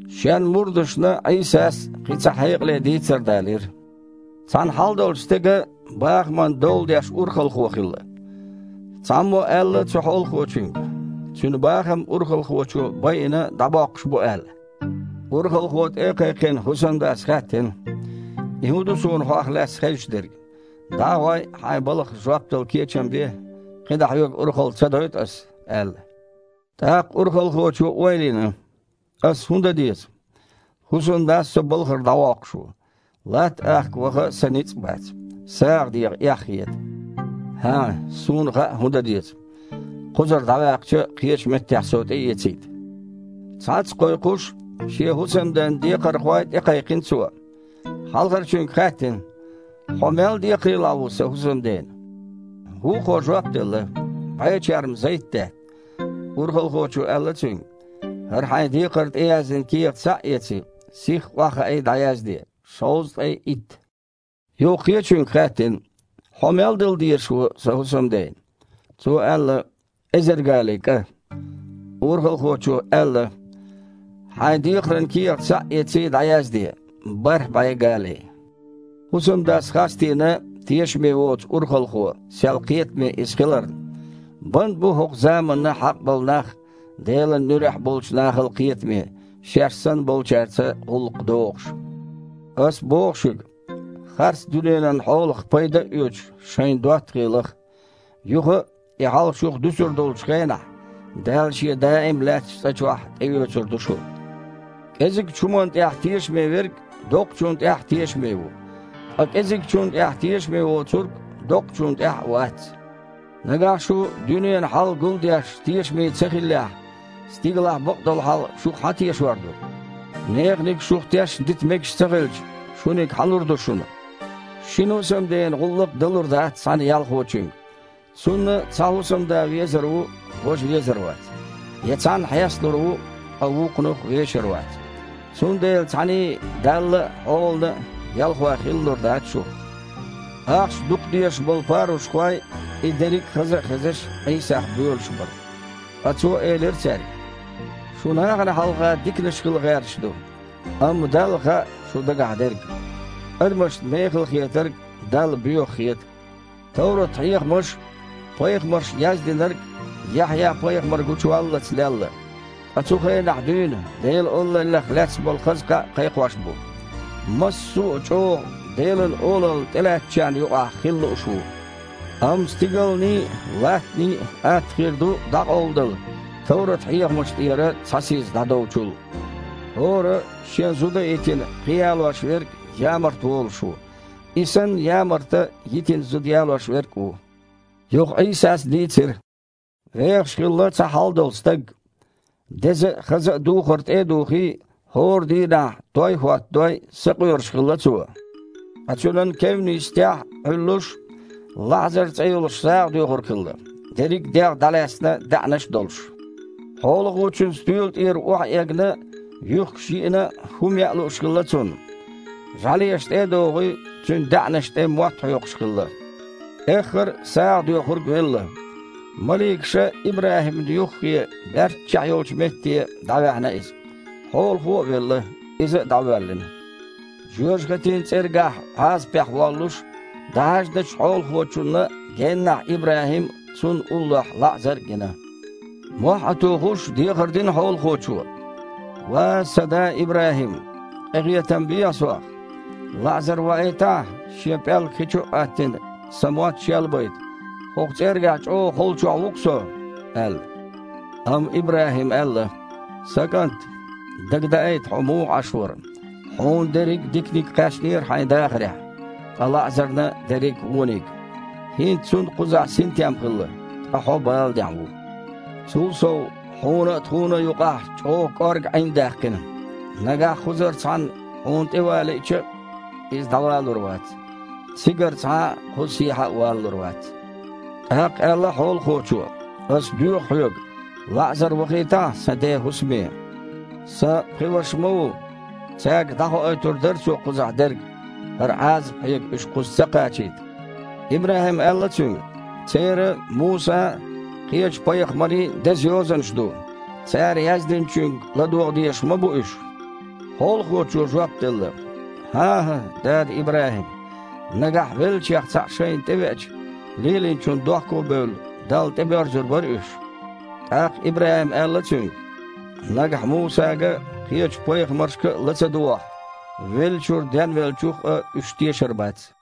Шен мурдашна Іийсас кхин цхьа хьекъале дийцар далийра: «Цхьана хьалдолчу стеган бахаман дола деш урхалхо хилла. Цхьаммо аьлла цу хьолахочуьнга, цуьнан бахам урхалхочо байина дІабоккхуш бу аьлла. Урхалхо тІе а кхайкхина, хІусамдас хаьттина: „И хІун ду суна хьох лаьцна хезаш дерг? ДІа а гІой, хьайн балхах жоп дала кечам бе, кхин дІа хьоьга урхалла ца дойту ас“, – аьлла. ТІаккха урхалхочо ойла йина: „Ас хІун дан деза? ХІусамдас со балхара дІавоккхуш ву. Латта ахка ваха сан ницкъ бац, сагІа деха эхь хета. ХІа! Суна хаьа хІун дан деза, кхузара дІаваьккхича кхечу меттехь со тІеэцийта“. Цхьацца кхойкхуш, шен хІусамден декхархой тІекхайкхина цо. Хьалхарчуьнга хаьттина: „Хьо мел декхарийлахь ву сан хІусамдена?“ Вукхо жоп делла: „БІе черма зайтдаьтта“. Урхалхочо аьлла цуьнга: „ХІара хьайн декхар тІеяздина кехат схьа а эций, сихха охьахаий, дІаязде: шовзткъе итт“. Юха кхечуьнга хаьттина: „Хьо мел дала дезаш ву сан хІусамдена?“ Цо аьлла: „Эзар гали кІа“. Урхалхочо аьлла: „Хьайн декхаран кехат схьа а эций, дІаязде: бархІ бІе гали“. ХІусамдас хастийна тешаме воцу урхалхо, сел кхетаме иза хиларна. Бан а бу хІокху заманна хьакъ болу нах Делан нуьрехь болчу нахал кхетаме, шаьш санна болчаьрца гІуллакх догІуш. Ас боху шуьга, харц дуьненан хьолах пайда а оьцуш, шайна доттагІий лаха. Юха, и хьал шух дуьсур долчу хенахь, Дала Шен даим лаьттачу цІа чохь тІеоьцур ду шу. КІезигчу хІуманна тІехь тешаме верг доккхачунна тІехь а тешаме ву, ткъа кІезигчунна тІехь тешаме воцург доккхачунна тІехь а вац. Нагахь шу дуьненан хьал гулдеш тешаме ца хиллехь, стигалахь бакъдолу хьал шух хьан тешор ду? Неханиг шух тешна дита мегаш ца хилча, шуниг хьан лур ду шуна? Шина хІусамдена гІуллакх далур дац цхьана ялхочуьнга. Цунна цхьа хІусамда везар ву, важа везар вац, я цхьанна хьесталур ву, ткъа вукхунах вешар вац. Цундела цхьаьний – Далла а, хьолана а ялхой хилалур дац шу». Ахча дукха дезаш болу парушхой и дерриг а хаза а хезаш, Іийсах боьлуш бара. Ткъа Цо элира цаьрга: «Шу нахана хьалха диканаш хила гІерташ ду, амма Далла хаьа шун дагахь дерг. Адамашна мехала хетарг Далла боьха хета. Товрат-хьехамаш а, пайхамарша яздинарг а Яхьъя-пайхамар гучуваллалц лелла, ткъа цу хенахь дуьйна Делан Олаллех лаьцна болу хаза кхаъ а кхайкхош бу. Массо а чІогІа Делан Олалла тІелаьцначарна юкъахь хила лууш а ву. Амма стигалний а, латтаний а атта хир ду дІакъовладала, товрат-хьехамаш тІера цхьа сиз дІадовчул. ХІора, шен зуда а йитина, кхин ялош верг ямарта волуш ву, и санна ямарта йитина зуда ялош верг а ву». Юха Іийсас дийцира: «Вехаш хилла цхьа хьалдолу стаг. Деза а, хаза а духар тІе а духий, хІора дийнахь той а хІоттадой, сакъоьруш хилла цо. Ткъа цуьнан кевнна йисттехь Іуьллуш, ЛаІзар цІе йолуш сагІадоьхург хилла, дерриг дегІ дІалаьцна даьІнаш а долуш. Хьолахочун стоьла тІера охьаэгна юьхкаш йиъна а, хІума яа лууш хилла цунна. ЖІаьлеша, тІе а догІий, цуьнан даьІнашна тІе мотт хьоькхуш хилла. Эххар а сагІадоьхург велла. Маликаша ИбрахІимна юххе, баьрччехь йолчу метте, дІаваьхьна иза. Хьолахо а велла, иза дІавоьллина. Жоьжахатин цІергахь Іазапехь воллуш, дІахьаьжначу хьолахочунна геннахь ИбрахІим а, цунна уллохь ЛаІзар а гина. Мохь а тухуш, дехар дина хьолахочо: „Ва сан да ИбрахІим! Къинхетам бехьа сох. ЛаІзар ваийтахьа, шен пІелг хи чу а Іоьттина, сан мотт шелбайта, хІокху цІергахь чІогІа холчохь ву-кх со!“ – аьлла. Амма ИбрахІима аьлла: „Сан кІант! Дагадаийта, хьо муха Іаш вара. Хьуна дерриг а диканиг кхаьчнера хьайн дахарехь, ткъа ЛаІзарна – дерриг вониг. ХІинца цунна кхузахь синтем хилла, ткъа хьо баланехь ву. Цул сов, хьуна а, тхуна а юкъахь чІогІа кІорга Іин даьккхина. Нагахь кхузара цхьанна хьуна тІеван лиъча а, иза дІавалур вац, цигара цхьа а кхуза сехьа а валалур вац“. ТІаккха аьлла хьолахочо: „Ас доьху хьоьга, ЛаІзар вахийтахьа сан ден хІусаме, сан пхи ваша ма ву. Цаьрга дІахоуьйтур дара цо кхузахь дерг, хІара Іазап хьега уьш кхуза ца кхачийта“. ИбрахІима аьлла цуьнга: „Церан Мусан а, кхечу пайхамарийн а деза йозанаш ду, цара яздинчуьнга ладогІа дезаш ма бу уьш!“ Хьолахочо жоп делла: „ХІан-хІа, дада ИбрахІим! Нагахь веллачех цхьаъ шайна тІевеача, лелийначунна дохко а бевлла, Далла тІебоьрзур бара уьш“. ТІаккха ИбрахІима аьлла цуьнга: „Нагахь Мусага а, кхечу пайхамаршка а ла ца догІахь, веллачуьра денвеллачух а уьш тешар бац“».